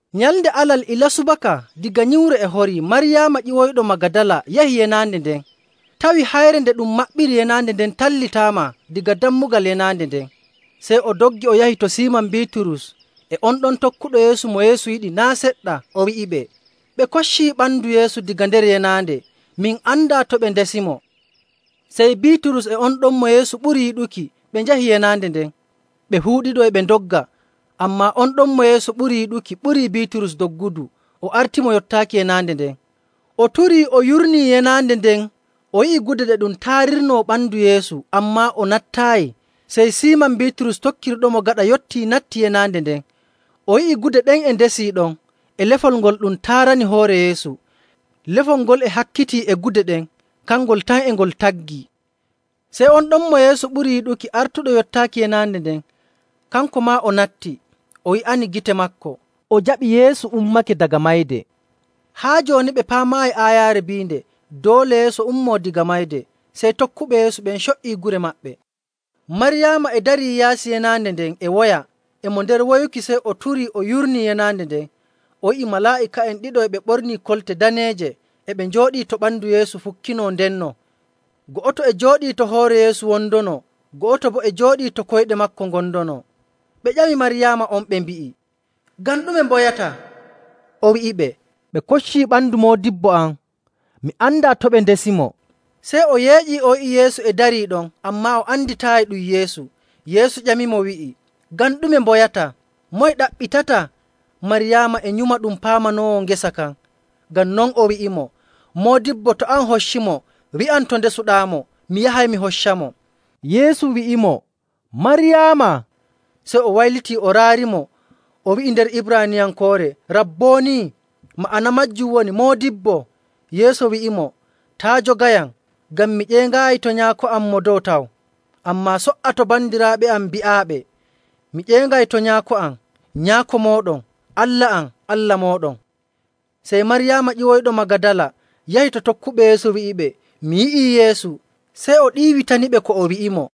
Nyalnde Alal ilaa subaka daga nyiwre e horii Maryaama ƴiwoyɗo Magadala yahi yenaande nden tawi hayre nde ɗum maɓɓiri yenaande nden tallitaama daga dammugal yenaande nden. Sey o doggi o yahi to Siiman Biiturus e on ɗon tokkuɗo Yeesu mo Yeesu yiɗi naa' seɗɗa, o wi'iɓe, “Ɓe koccii ɓandu Yeesu daga nder yenaande! Min andaa to ɓe ndesimo.” Sey Biiturus e on ɗon mo Yeesu ɓuri yiɗuki ɓe njahi yenaande nden. Ɓe fuu ɗiɗo e ɓe ndogga, ammaa on ɗon mo Yeesu ɓuri yiɗuki ɓurii Biiturus doggudu o artimo yottaaki yenaande nden. O turii o yurnii yenaande nden o yi'i gude ɗe ɗum taarirnoo ɓandu Yeesu, ammaa o nattaayi. Sey Siiman Biiturus tokkirɗomo gaɗa yottii, natti yenaande nden. O yi'i gude ɗen e ndesii ɗon, e lefol ngol ɗum taarani hoore Yeesu. Lefol ngol e hakkitii e gude ɗen, kangol tan e ngol taggii. Sey on ɗon mo Yeesu ɓuri yiɗuki artuɗo yottaaki yenaande nden, kanko maa o natti, o yi'ani gite maako, o jaɓi Yeesu ummake daga mayde. Haa jooni ɓe paamaayi aayaare biinde doole Yeesu ummoo daga mayde. Sey tokkuɓe Yeesu ɓen co''i gure maɓɓe. Maryaama e darii yaasi yenaande nden e woya. E mo nder woyuki, sey o turii o yurnii yenaande nden, o yi'i malaa'ika'en ɗiɗo e ɓe ɓornii kolte daneeje, e ɓe njooɗii to ɓandu Yeesu fukkinaa ndenno. Go'oto e jooɗii to hoore Yeesu wondonoo, go'oto boo e jooɗii to koyɗe maako gondonoo. Ɓe ƴami Maryaama on ɓe mbi'i, “Ngam ɗume mboyataa?” O wi'iɓe, “Ɓe koccii ɓandu Moodibbo am, mi andaa to ɓe ndesimo.” Sey o yeeƴii o yi'i Yeesu e darii ɗon, ammaa o anditaayi ɗum Yeesu. Yeesu ƴamimo wi'i, “Ngam ɗume mboyataa? Moye ɗaɓɓitataa?” Maryaama e nyuma ɗum paamanoowo ngesa kan, ngam non o wi'imo, “Moodibbo, to an hoccimo, wi'am to ndesuɗaamo mi yahay mi hoccamo.” Yeesu wi'imo, “Maryaama.” Sey o waylitii o raarimo o wi'i nder Ibraaniyankoore, “Rabboni!” Ma'ana maajum woni “Moodibbo.” Yeesu wi'imo, “Taa' jogayam, ngam mi ƴeeŋaayi to Nyaako am Mo Dow taw. Ammaa so''a to bandiraaɓe am mbi'aaɓe mi ƴeeŋay to Nyaako am, Nyaako mooɗon, Allah am, Allah mooɗon.” Sey Maryaama ƴiwoyɗo Magadala yahi to tokkuɓe Yeesu wi'iɓe, “Mi yi'ii Yeesu!” Sey o ɗiiwitaniɓe ko o wi'imo.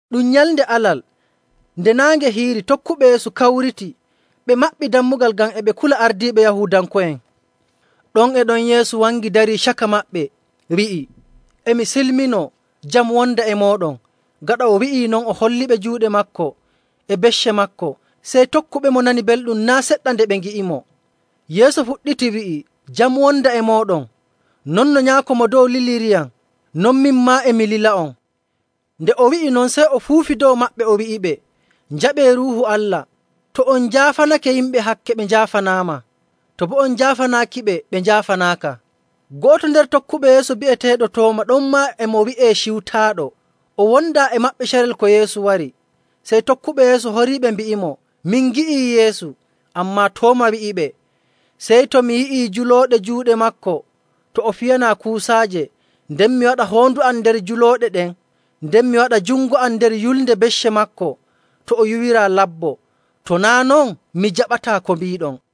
Ɗum nyalnde Alal. Nde naange hiiri, tokkuɓe Yeesu kawriti, ɓe maɓɓi dammugal ngam e ɓe kula ardiiɓe Yahuudanko'en. Ɗon e ɗon Yeesu wangi darii caka maɓɓe, wi'i, “E mi silminoo. Jam wonda e mooɗon.” Gaɗa o wi'i non, o holliɓe juuɗe maako e becce maako. Sey tokkuɓemo nani belɗum naa' seɗɗa nde ɓe ngi'imo. Yeesu fuɗɗiti wi'i, “Jam wonda e mooɗon! Non no Nyaako Mo Dow liliriyam, non min maa e mi lila'on.” Nde o wi'i non, sey o fuufi dow maɓɓe o wi'iɓe, “Njaɓee Ruuhu Allah. To on njaafanake yimɓe hakke, ɓe njaafanaama, to boo on njaafanaakiɓe, ɓe njaafanaaka.”. Go'oto nder tokkuɓe Yeesu, bi'eteeɗo Tooma (ɗonmaa e mo wi'ee Ciwtaaɗo), o wondaa e maɓɓe carel ko Yeesu wari. Sey tokkuɓe Yeesu horiiɓe mbi'imo, “Min ngi'ii Yeesu.” Ammaa Tooma wi'iɓe, “Sey to mi yi'ii julooɗe juuɗe maako to o fiyanaa kuusaaje nden mi waɗa hoondu am nder julooɗe ɗen, nden mi waɗa jungo am nder yulnde becce maako to o yuwiraa labbo, to naa' non, mi jaɓataa ko mbiiɗon.”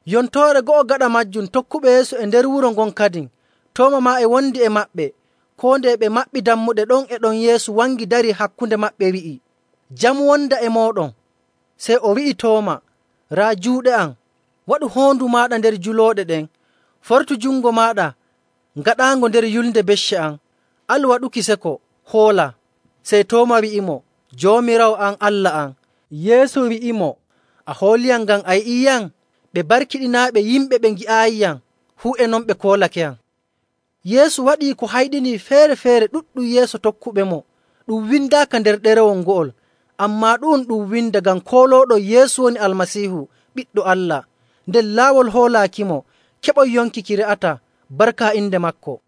Yontoore go'o gaɗa maajum, tokkuɓe Yeesu e nder wuro ngon kadin, Tooma maa e wondi e maɓɓe. Koo nde e ɓe maɓɓi dammuɗe, ɗon e ɗon Yeesu wangi darii hakkunde maɓɓe wi'i, “Jam wonda e mooɗon.” Sey o wi'i Tooma, “Raa juuɗe am. Waɗu hoondu maaɗa nder julooɗe ɗen. Fortu jungo maaɗa ngaɗaango nder yulnde becce am. Alu waɗuki seko, hoola.” Sey Tooma wi'imo, “Joomiraawo am, Allah am!” Yeesu wi'imo, “A hooliyam ngam a yi'iiyam? Ɓe barkiɗinaaɓe yimɓe ɓe ngi'aayiyam, fuu e non ɓe koolakeyam.” Yeesu waɗii ko hayɗinii feere‑feere ɗuɗɗum yeeso tokkuɓemo ɗum windaaka nder ɗerewol ngo'ol. Ammaa ɗu'um ɗum windaa ngam koolooɗon Yeesu woni Almasiihu Ɓiɗɗo Allah, nden laawol hoolaakimo keɓon yonki ki re'ataa barka inde maako.